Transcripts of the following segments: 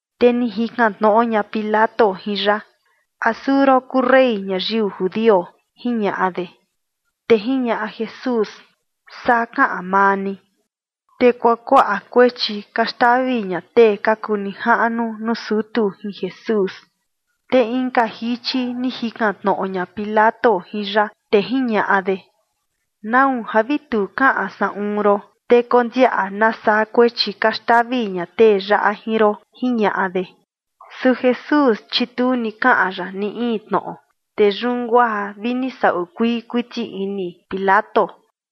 Te ni jikan tnoꞌo ña Pilato jin ya: ―¿A suu ron kuu rey ñayiu judio? ―jiñaꞌa de. Te jiñaꞌa Jesús: ―Saa kaꞌan maa ni. Te kuakuaꞌa kuechi ka xtavi ña tee ka kuu nijaꞌnu nuu sutu jin Jesús. Te inka jichi ni jikan tnoꞌo ña Pilato jin ya, te jiñaꞌa de: ―¿Nau ja vi tu kaꞌan saꞌun ron? Te kondiaꞌa nasaa kuechi ka xtavi ña tee yaꞌa jin ron ―jiñaꞌa de. Su Jesús, chi tu ni kaꞌan ya ni in tnoꞌo. Te yun guaa vi ni saꞌu kuii kuiti ini Pilato.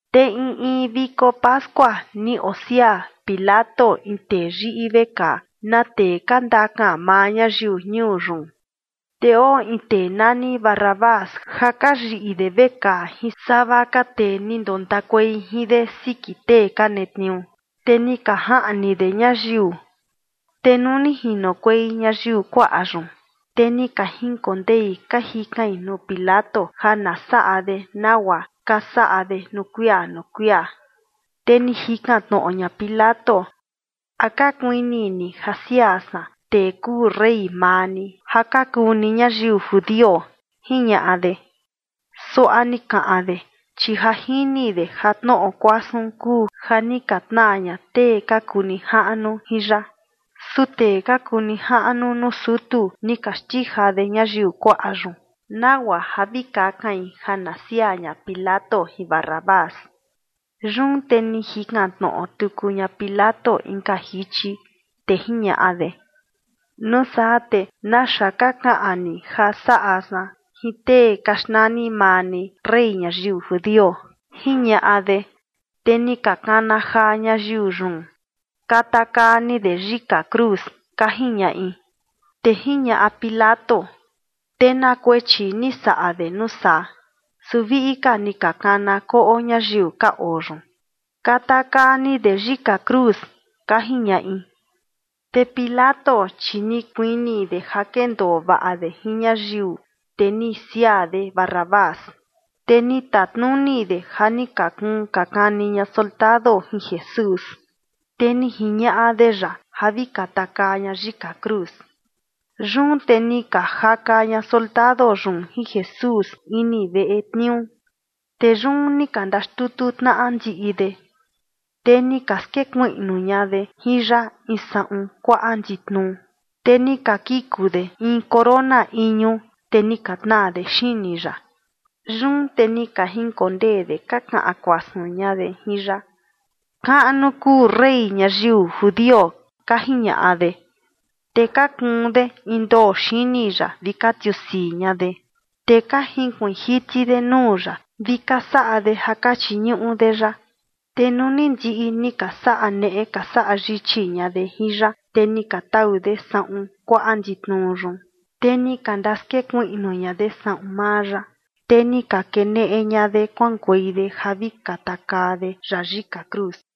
Te in in viko pascua ni osiaa Pilato in tee yiꞌi vekaa, na tee ka ndakan maa ñayiu ñuu yun. Te oo in tee nani Barrabás ja ka yiꞌi de vekaa jin sava ka tee ni ndontakuei jin de siki tee ka netniuu, te ni ka jaꞌni de ñayiu. Te nuu ni jinokuei ñayiu kuaꞌa yun, te ni ka jinkondei ka jikain nuu Pilato ja na saꞌa de nagua ka saꞌa de nuu kuia nuu kuia. Te ni jikan tnoꞌo ña Pilato: ―¿A ka kuini ni ja siaa san tee kuu rey maa ni ja ka kuu ni ñayiu judio? ―jiñaꞌa de. Suaꞌa ni kaꞌan de, chi ja jini de ja tnoꞌo kuasun kuu ja ni ka tnaa ña tee ka kuu nijaꞌnu jin ya. Su tee ka kuu nijaꞌnu nuu sutu ni ka xtija de ñayiu kuaꞌa yun nagua ja vi kakain ja na siaa ña Pilato jin Barrabás. Yun te ni jikan tnoꞌo tuku ña Pilato inka jichi, te jiñaꞌa de: ―Nuu saa, ¿te naxa ka kaꞌan ni ja saꞌa san jin tee ka xnani maa ni rey ñayiu judio? ―jiñaꞌa de. Te ni ka kana jaa ñayiu yun: ―Katakaa ni de yika cruz ―ka jiñaꞌi. Te jiñaꞌa Pilato: ―¿Te na kuechi ni saꞌa de nuu saa? Su viꞌi ka ni ka kana koꞌo ñayiu ka oo yun: ―Katakaa ni de yika cruz ―ka jiñaꞌi. Te Pilato, chi ni kuini de ja kendoo vaꞌa de jin ñayiu, te ni siaa de Barrabás, te ni tatnuni de ja ni ka kuun ka kani ña soldado jin Jesús, te ni jiñaꞌa de ya ja vi katakaa ña yika cruz. Yun te ni ka jaka ña soldado yun jin Jesús ini veꞌe tniuu. Te yun ni ka ndaxtutu tnaꞌa ndiꞌi de. Te ni ka skekuiꞌnu ña de jin ya in saꞌun kuaꞌa nditnuu, te ni ka kiku de in corona iñu, te ni ka tnaa de xini ya. Yun te ni ka jinkondee de ka kaꞌan kuasun ña de jin ya: ―¡Kaꞌnu kuu rey ñayiu judio! ―ka jiñaꞌa de. Te ka kuun de in ndoo xini ya vi ka tiusii ña de, te ka junkuiin jiti de nuu ya vi ka saꞌa de ja ka chiñuꞌu de ya. Te nuu ni ndiꞌi ni ka saꞌa neꞌe ka saꞌa yichi ña de jin ya, te ni ka tau de saꞌun kuaꞌa nditnuu yun, te ni ka ndaskekuiꞌnu ña de saꞌun maa ya, te ni ka keneꞌe ña de kuaꞌankuei de ja vi katakaa de ya yika cruz.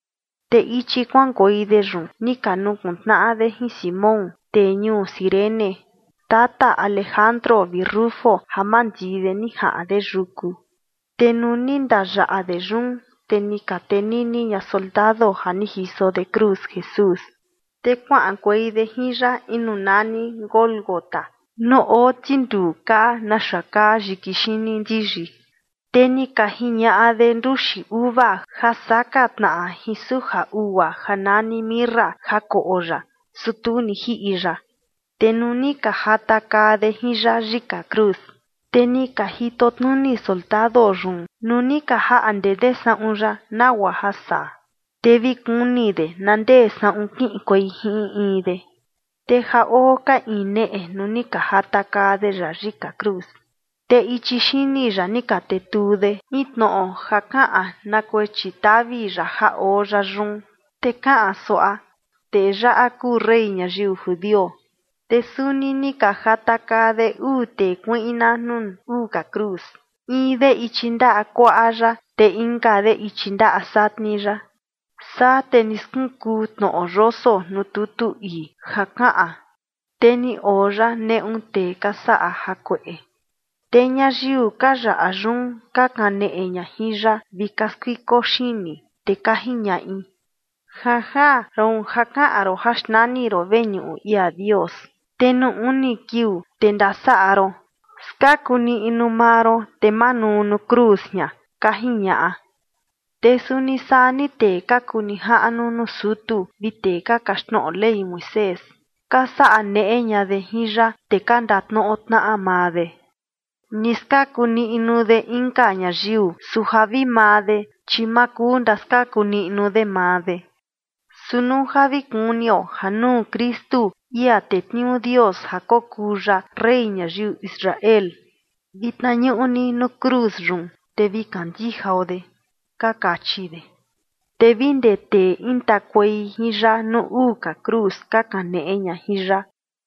Te ichi kuaꞌankuei de yun ni ka nukuntnaꞌa de jin Simón, tee ñuu Cirene, tata Alejandro vi Rufo, ja mandii de ni jaꞌan de yuku. Te nuu ni ndayaꞌa de yun, te ni ka tenini ña soldado ja ni jiso de cruz Jesús. Te kuaꞌankuei de jin ya in nuu nani Gólgota nuu oo tinduu kaa naxa kaa yiki xini ndiyi. Te ni ka jiñaꞌa de nduxi uva ja saka tnaꞌa jin suja ugua ja nani mirra ja koꞌo ya, su tu ni jiꞌi ya. Te nuu ni ka jatakaa de jin ya yika cruz, te ni ka jitotnuni soldado yun nuu ni ka ndakaꞌnde de saꞌun ya, nagua ja saa, te vi kuni de na ndee saꞌun kiꞌinkuei jin in in de. Te ja oo ka iin neꞌe nuu ni ka jatakaa de ya yika cruz. Te ichi xini ya ni ka tetuu de in tnoꞌo ja kaꞌan na kuechi tavi ya ja oo ya yun, te kaꞌan suaꞌa: “Tee yaꞌa kuu rey ñayiu judio”. Te suni ni ka jatakaa de uu tee kuiꞌna nuu uu ka cruz, in de ichi ndaꞌa kuaꞌa ya, te inka de ichi ndaꞌa satni ya. Saa te ni skunkuu tnoꞌo yoso nuu tutu ii ja kaꞌan: “Te ni oo ya neꞌu tee ka saꞌa jakueꞌe”. Te ñayiu ka yaꞌa yun ka kaneꞌe ña jin ya vi ka skuiko xini, te ka jiñaꞌi: ―Janjaan, roon ja kaꞌan ron ja xnani ron veñuꞌu ia Dios, te nuu uni kiuu, te ndasaꞌa ron, skaku niꞌnu maa ron, te manuu nuu cruz jian ―ka jiñaꞌa. Te suni saa ni tee ka kuu nijaꞌnu nuu sutu vi tee ka kaxtnoꞌo Ley Moisés, ka saꞌa neꞌe ña de jin ya, te ka ndatnoꞌo tnaꞌa maa de: ―Ni skaku niꞌnu de inka ñayiu, su ja vi maa de, chi ma kuu ndaskaku niꞌnu de maa de. Su nuu ja vi kunio ja nuu Kristu, ia tetniuu Dios ja kokuu ya rey ñayiu Israel, vitna ñuꞌni nuu cruz yun, te vi kandijao de ―ka kachi de. Te vi ndee tee intakuei jin ya nuu uu ka cruz ka kaneꞌe ña jin ya.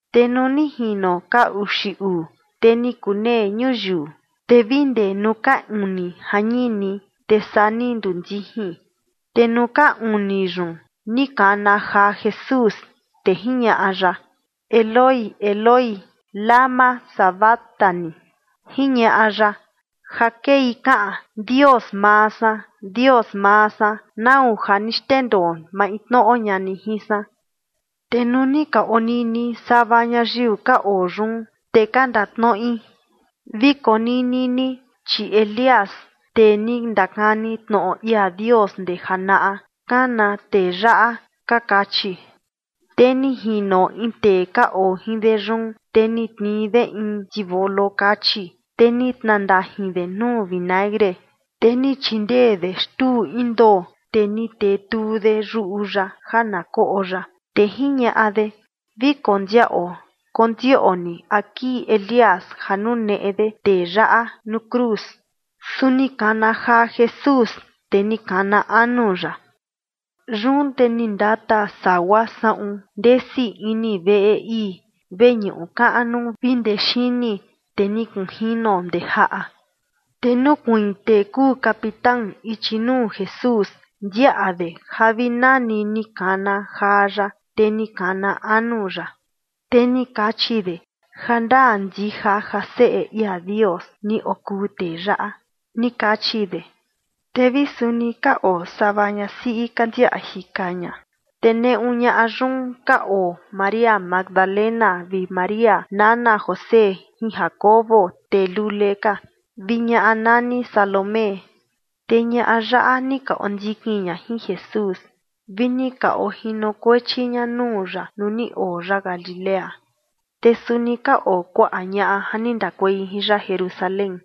Te nuu ni jino ka uxi uu, te ni kunee ñuyiu, te vi ndee nuu ka uni jañini, te saa ni nduu ndijin. Te nuu ka uni yun ni kana jaa Jesús, te jiñaꞌa ya: ―Eloi, Eloi, ¿lama sabactani? ―jiñaꞌa ya. Ja kei kaꞌan: Dios maa san, Dios maa san, ¿nau ja ni xndendoo maintnoꞌo ña ni jin san? Te nuu ni ka onini sava ñayiu ka oo yun, te ka ndatnoꞌi: ―Vi konini ni, chi Elías, tee ni ndakani tnoꞌo ia Dios ndee janaꞌa, kana tee yaꞌa ―ka kachi. Te ni jino in tee ka oo jin de yun, te ni tnii de in tivolo kachi, te ni tnandajin de nuu vinagre, te ni chindee de xtuu in ndoo, te ni tetuu de yuꞌu ya ja na koꞌo ya, te jiñaꞌa de: ―Vi kondiaꞌo kondioꞌni a kii Elías ja nuneꞌe de tee yaꞌa nuu cruz. Su ni kana jaa Jesús, te ni kana anu ya. Yun te ni ndata sagua saꞌun ndesi ini veꞌe ii veñuꞌu kaꞌnu vi ndee xini, te ni kunjino ndee jaꞌa. Te nukuiin tee kuu capitán ichi nuu Jesús ndiaꞌa de ja vi nani ni kana jaa ya, te ni kana anu ya, te ni kachi de: ―Jandaa ndija ja Seꞌe ia Dios ni okuu tee yaꞌa ―ni kachi de. Te vi suni ka oo sava ñasiꞌi ka ndiaꞌa jika ña, te neꞌu ñaꞌa yun ka oo María Magdalena vi María nana José jin Jacobo, tee lule ka, vi ñaꞌa nani Salomé. Te ñaꞌa yaꞌa ni ka ondikin ña jin Jesús vi ni ka ojinokuechi ña nuu ya nuu ni oo ya Galilea. Te suni ka oo kuaꞌa ñaꞌa ja ni ndakuei jin ya Jerusalén.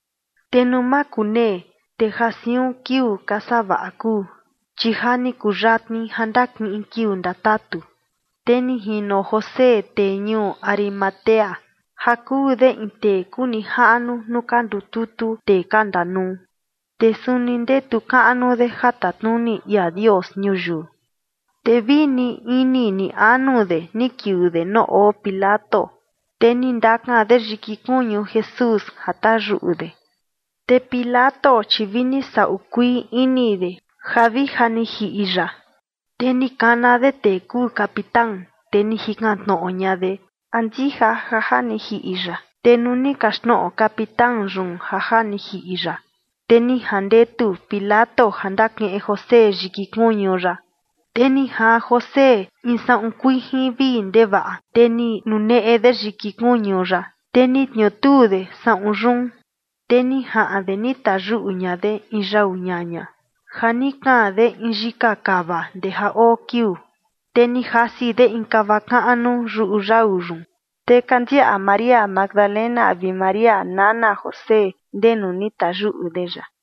Te nuu makunee, te ja siun kiuu ka savaꞌa kuu, chi ja ni kuyatni ja ndakiꞌin kiuu ndatatu, te ni jino José tee ñuu Arimatea, ja kuu de in tee kuu nijaꞌnu nuu ka ndututu tee ka ndanuu, te suni ndetu kaꞌnu de ja tatnuni ia Dios ñuyiu. Te vi ni ini ni anu de ni kiuu de nuu oo Pilato, te ni ndakan de yiki kuñu Jesús ja tayuꞌu de. Te Pilato, chi vi ni saꞌu kuii ini de ja vi ja ni jiꞌi ya. Te ni kana de tee kuu capitán, te ni jikan tnoꞌo ña de a ndija ja ja ni jiꞌi ya. Te nuu ni kaxtnoꞌo capitán yun ja ja ni jiꞌi ya, te ni jandetu Pilato ja ni ndakiꞌin José yiki kuñu ya. Te ni jaan José in saꞌun kuijin vii ndevaꞌa, te ni nuneꞌe de yiki kuñu ya, te ni tniutuu de saꞌun yun. Te ni jaꞌan de ni tayuꞌu ña de in yau ñaña ja ni kaan de in yika kava ndee ja oo kiuu, te ni jasi de in kava kaꞌnu yuꞌu yau yun. Te ka ndiaꞌa María Magdalena vi María nana José ndenu ni tayuꞌu de ya.